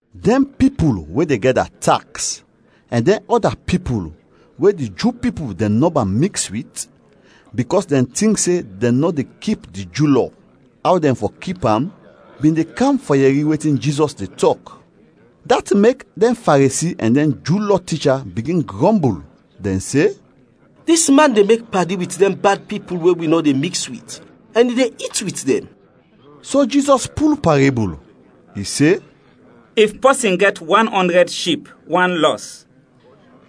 Dɛn pipul we de gɛda taks ɛn dɛn ɔda pipul we di Ju pipul dɛn nɔba miks wit bikɔs dɛn tink se dɛn nɔ de kip di Ju Lɔ aw dɛn fɔ kip am, bin de kam fɔ yɛri wetin Jizɔs de tɔk. Dat mek dɛn Faresi ɛn dɛn Ju Lɔ ticha bigin grɔmbul, dɛn se, “Dis man de mek padi wit dɛn bad pipul we wi nɔ de miks wit, ɛn i de it wit dɛn.” So Jizɔs pul parebul. I se: “If pɔsin gɛt wan ɔndrɛd ship, wan lɔs,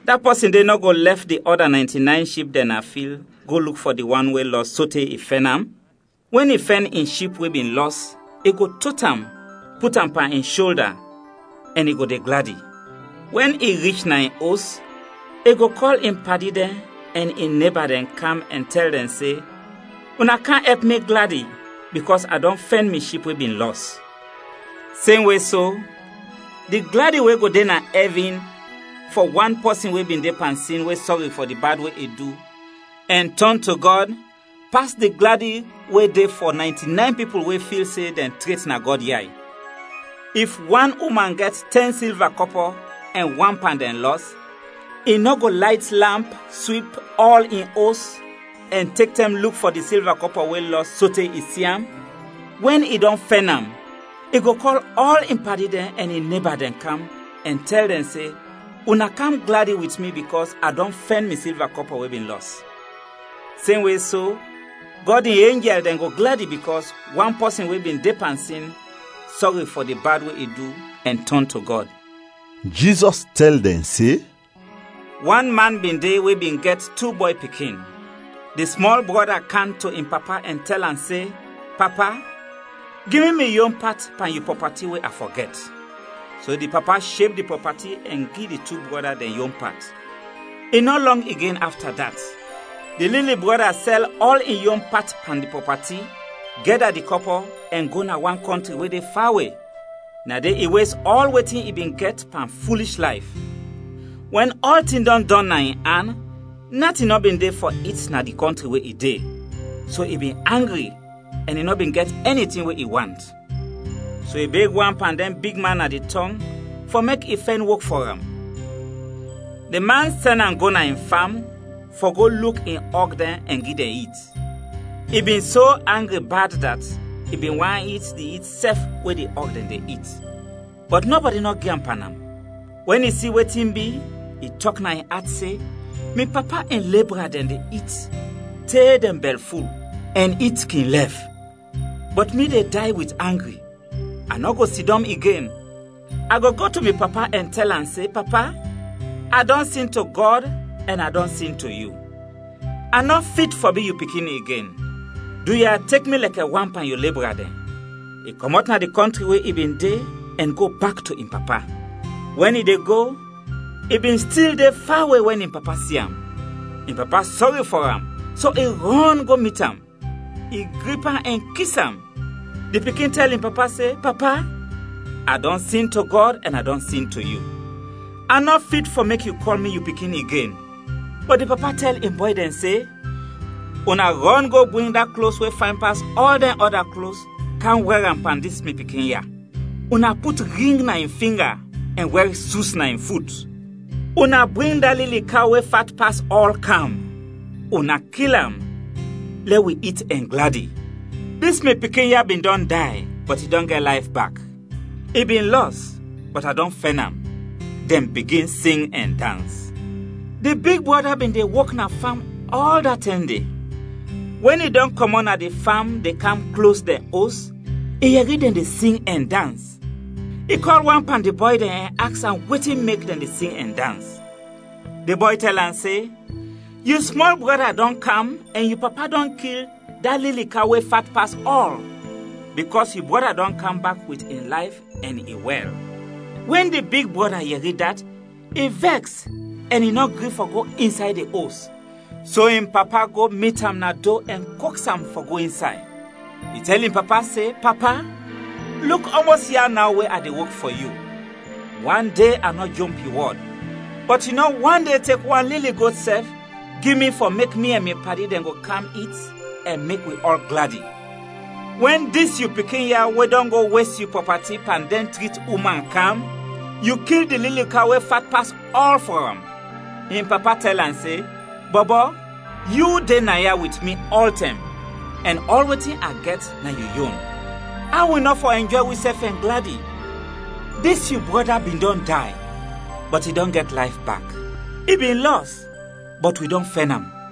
da pɔsin de nɔ go lɛf di ɔda naynti-nayn ship dɛn na fil go luk fɔ di wan we lɔs sote i fɛn am? Wɛn i fɛn in ship we bin lɔs, i go tot am, put am pan in sholda, ɛn i go de gladi. Wɛn i rich na in os, i go kɔl in padi dɛn ɛn in neba dɛn kam ɛn tɛl dɛn se, ‘Una kam ɛp mi gladi bikɔs a dɔn fɛn mi ship we bin lɔs!’ Semwe so, di gladi we go de na ɛvin fɔ wan pɔsin we bin de pan sin we sɔri fɔ di bad we i du ɛn tɔn to Gɔd pas di gladi we de fɔ naynti-nayn pipul we fil se dɛn tret na Gɔd yay. “If wan uman gɛt tɛn silva kɔpɔ ɛn wan pan dɛn lɔs, i nɔ go layt lamp, swip ɔl in os, ɛn tek tɛm luk fɔ di silva kɔpɔ we lɔs sote i si am? Wɛn i dɔn fɛn am, i go kɔl ɔl in padi dɛn ɛn in neba dɛn kam ɛn tɛl dɛn se, ‘Una kam gladi wit mi bikɔs a dɔn fɛn mi silva kɔpɔ we bin lɔs!’ Semwe so, Gɔd in enjɛl dɛn go gladi bikɔs wan pɔsin we bin de pan sin sɔri fɔ di bad we i du ɛn tɔn to Gɔd.” Jizɔs tɛl dɛn se, “Wan man bin de we bin gɛt tu bɔy pikin. Di smɔl brɔda kam to in papa ɛn tɛl am se, ‘Papa, gi mi mi yon pat pan yu prɔpati we a fɔ gɛt.’ So di papa sheb di prɔpati ɛn gi di tu brɔda dɛn yon pat. I nɔ lɔng igen afta dat, di lili brɔda sɛl ɔl in yon pat pan di prɔpati, gɛda di kɔpɔ ɛn go na wan kɔntri we de fawe. Na de i wes ɔl wetin i bin gɛt pan fulish layf. Wɛn ɔltin dɔn dɔn na in an, natin nɔ bin de fɔ it na di kɔntri we i de, so i bin angri ɛn i nɔ bin gɛt ɛni tin we i want. So i beg wan pan dɛn bigman na di tɔng fɔ mek i fɛn wok fɔ am. Di man sɛn am go na in fam fɔ go luk in ɔg dɛn ɛn gi dɛn it. I bin so angri bad dat i bin want it di it sɛf we di ɔg dɛn de it, bɔt nɔbɔdi nɔ gi am pan am. Wɛn i si wetin bi, i tɔk na in at se, ‘Mi papa in lebra dɛn de it te dɛn bɛlful, ɛn it kin lɛf, bɔt mi de day wit angri! A nɔ go sidɔm igen, a go go to mi papa ɛn tɛl am se, Papa, a dɔn sin to Gɔd ɛn a dɔn sin to yu. A nɔ fit fɔ bi yu pikin igen, duya, tek mi lɛkɛ wan pan yu lebra dɛn.’ I kɔmɔt na di kɔntri we i bin de ɛn go bak to in papa. “Wɛn i de go, i bin stil de fawe wɛn in papa si am. In papa sɔri fɔ am, so i rɔn go mit am, i grip am ɛn kis am. Di pikin tɛl in papa se, ‘Papa, a dɔn sin to Gɔd ɛn a dɔn sin to yu. A nɔ fit fɔ mek yu kɔl mi yu pikin igen.’ Bɔt di papa tɛl in bɔy dɛn se, ‘Una rɔn go bring da klos we fayn pas ɔl dɛn ɔda klos kam wɛr am pan dis mi pikin ya, una put ring na in finga ɛn wɛr sus na in fut. Una bring da lili kaw we fat pas ɔl, kam; una kil am, lɛ wi it ɛn gladi! Dis mi pikin ya bin dɔn day, bɔt i dɔn gɛt layf bak. I bin lɔs, bɔt a dɔn fɛn am.’ Dɛn bigin sing ɛn dans. “Di big brɔda bin de wok na fam ɔl da tɛm de. Wɛn i dɔn kɔmɔt na di fam de kam klos dɛn os, i yɛri dɛn de sing ɛn dans. I kɔl wan pan di bɔy dɛn ɛn aks am wetin mek dɛn de sing ɛn dans. Di bɔy tɛl am se, ‘Yu smɔl brɔda dɔn kam ɛn yu papa dɔn kil da lili kaw we fat pas ɔl, bikɔs yu brɔda dɔn kam bak wit in layf ɛn i wɛl.’ “Wɛn di big brɔda yɛri dat, i vɛks ɛn i nɔ gri fɔ go insay di os, so in papa go mit am na do ɛn koks am fɔ go insay. I tɛl in papa se, ‘Papa, luk ɔmɔs ia naw we a de wok fɔ yu, wande a nɔ jomp yu wɔd, bɔt yu nɔ wande tek wan lili got sɛf gi mi fɔ mek mi ɛn mi padi dɛn go kam it ɛn mek wi ɔl gladi. Wɛn dis yu pikin ya we dɔn go wes yu prɔpati pan dɛn trit uman, kam, yu kil di lili kaw we fat pas ɔl fɔ am!’ In papa tɛl am se, ‘Bɔbɔ, yu de naya wit mi ɔltɛm ɛn ɔl wetin a gɛt na yu yon. Aw wi nɔ fɔ ɛnjɔy wisɛf ɛn gladi, dis yu brɔda bin dɔn day, bɔt i dɔn gɛt layf bak; i bin lɔs, bɔt wi dɔn fɛn am.’”